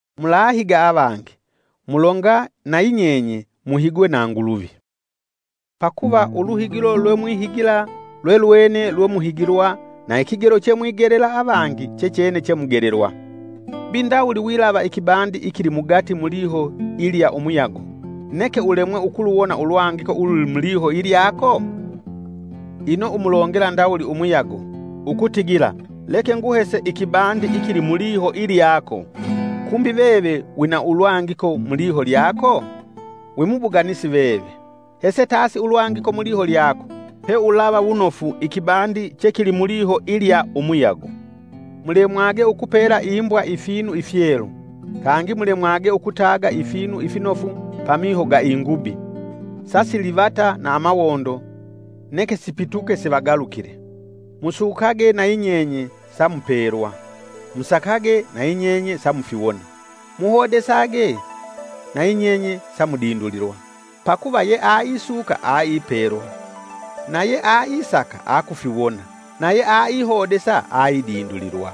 “Mulahiga avangi, mulonga nayi nyenye muhigwe na Nguluvi. Pakuva uluhigilo lwemuhigila lwelwene lwemuhigilwa na ikigelo che mwigelela avangi chechene chemugelelwa. Mbi ndawuli wilava ikibandi ikilimugati muliho ilya umuyago, neke ulemwe ukuluwona ulwangiko ululi muliho ilyako? Ino umulongela ndawuli umuyago, ‘Ukutigila leke nguhese ikibandi ikili muliho ilyako.’” Kumbi veve wina ulwangiko muliho lyako? Wimubuganisi veve! Hese tasi ulwangiko muliho lyako, peulava wunofu ikibandi chekili muliho ilya umuyago. “Mulemwage ukupela imbwa ifinu ifyelu, kangi mulemwage ukutaga ifinu ifinofu pamiho ga ingubi, sasilivata na amawondo neke sipituke sivagalukile.” “Musukage nayi nyenye samupelwa; musakage, nayi nyenye samufiwona; muhodesage, nayi nyenye samudindulilwa. Pakuva ye aisuka aipelwa, naye aisaka akufiwona, naye aihodesa aidindulilwa.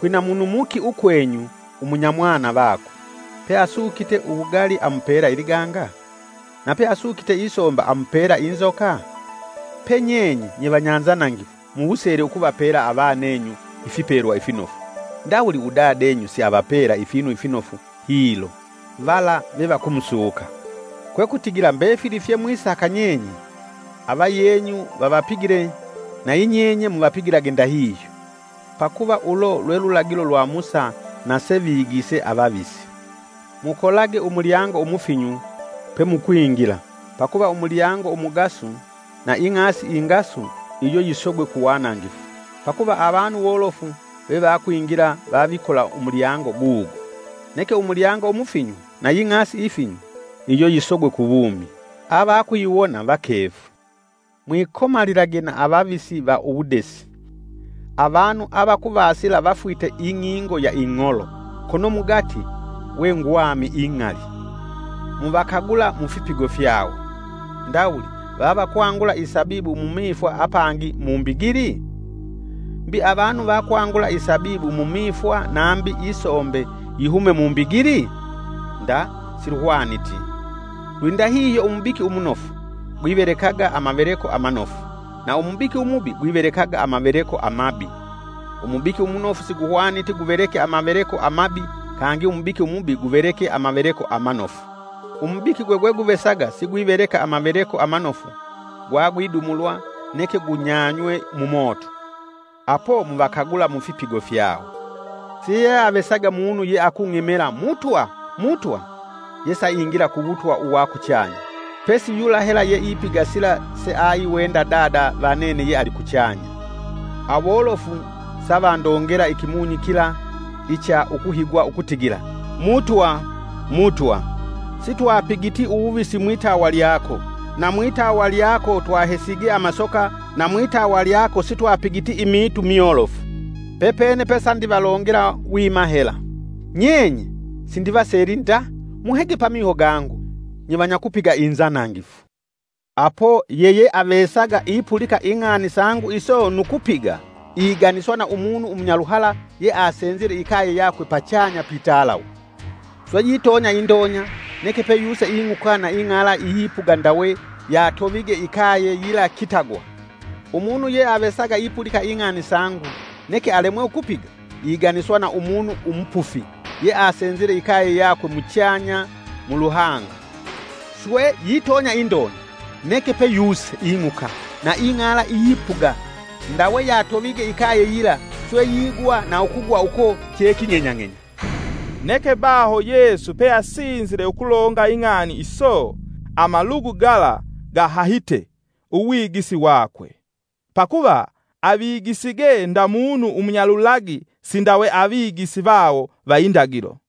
Kwina munu muki ukwenyu umunya mwana vakwe, pe asukite uwugali amupela iliganga? Nape asukite isomba amupela inzoka? Pe nyenye, nyevanyanzanangifu muwusele ukuvapela avanenyu ifipelwa ifinofu, ndawuli Udadenyu siavapela ifinu ifinofu hilo; vala vevakumusuka. Kwekutigila mbefili fye mwisaka nyenye avayenyu vavapigile nayi nyenye muvapigilage ndahihyo. Pakuva ulo lwe lulagilo lwa Musa na sevigise avavisi.” “Mukolage umulyango umufinyu pe mukwingila pakuva umulyango umugasu, na ing'asi ingasu iyo yisogwe kuwanangifu; pakuva avanu wolofu vevakwingila vavikola umulyango gugo. Neke umulyango umufinyu na ying'asi ifinyu iyo yisogwe kuwumi; avakuyiwona vakefu.” “Mwikomalilage na avavisi va uwudesi. Avanu avakuvasila vafwite ing'ingo ya ing'olo, kono mugati we ngwami ing'ali. Muvakagula mufipigo fyawo. Ndawuli vavakwangula isabibu mumifwa apangi mumbigili? Mbi avanu vakwangula isabibu mumifwa, nambi isombe yihume mumbigili? Nda siluhwaniti! Lwindahihyo, umubiki umunofu gwivelekaga amaveleko amanofu na umubiki umubi gwivelekaga amaveleko amabi. Umubiki umunofu siguhwaniti guveleke amaveleko amabi kangi umubiki umubi guveleke amaveleko amanofu. Umubiki gwe gweguvesaga sigwiveleka amaveleko amanofu gwagwidumulwa neke gunyanywe mumoto. Apo muvakagula mufipigo fyawo.” “Siyeavesaga munu yeakung'emela, ‘Mutwa, Mutwa’ yesaingila ku wutwa uwa kuchanya; pesi yula hela yeipiga sila seaiwenda Dada va nene ye alikuchanya. Awolofu savandongela ikimunyi kila icha ukuhigwa ukutigila: ‘Mutwa, Mutwa! Sitwapigiti uwuvisi mwitawa lyako, na mwitawa lyako twahesige amasoka na mwitawa lyako sitwapigiti imiitu myolofu.’ Pepene pesandivalongela wima hela, ‘Nyenye sindivaseli nda muhege pamiho gangu nyevanyakupiga inzanangifu.’ “Apo yeyeavesaga ipulika ing'ani sangu iso nu kupiga, iganiswa na umunu umunyaluhala ye asenzile ikaye yakwe pachanya pitalawe. Swe yitonya indonya neke peyuse ing'uka na ing'ala iyipuga ndawe yatovige ikaye yila kitagwa. Umunu yeavesaga ipulika ing'ani sangu neke alemwe ukupiga, iganiswa na umunu umupufi ye asenzile ikaye yakwe muchanya muluhanga. Swe yitonya indonya neke peyuse ing'uka na ing'ala iyipuga ndawe yatovige ikaye yila swe yigwa na ukugwa uko cheking'enyang'enya.” Neke baho Yesu pe asinzile ukulonga ing'ani iso, amalugu gala gahahite uwigisi wakwe. Pakuva avigisige nda munu umunyalulagi sindawe Avigisi vawo va indagilo.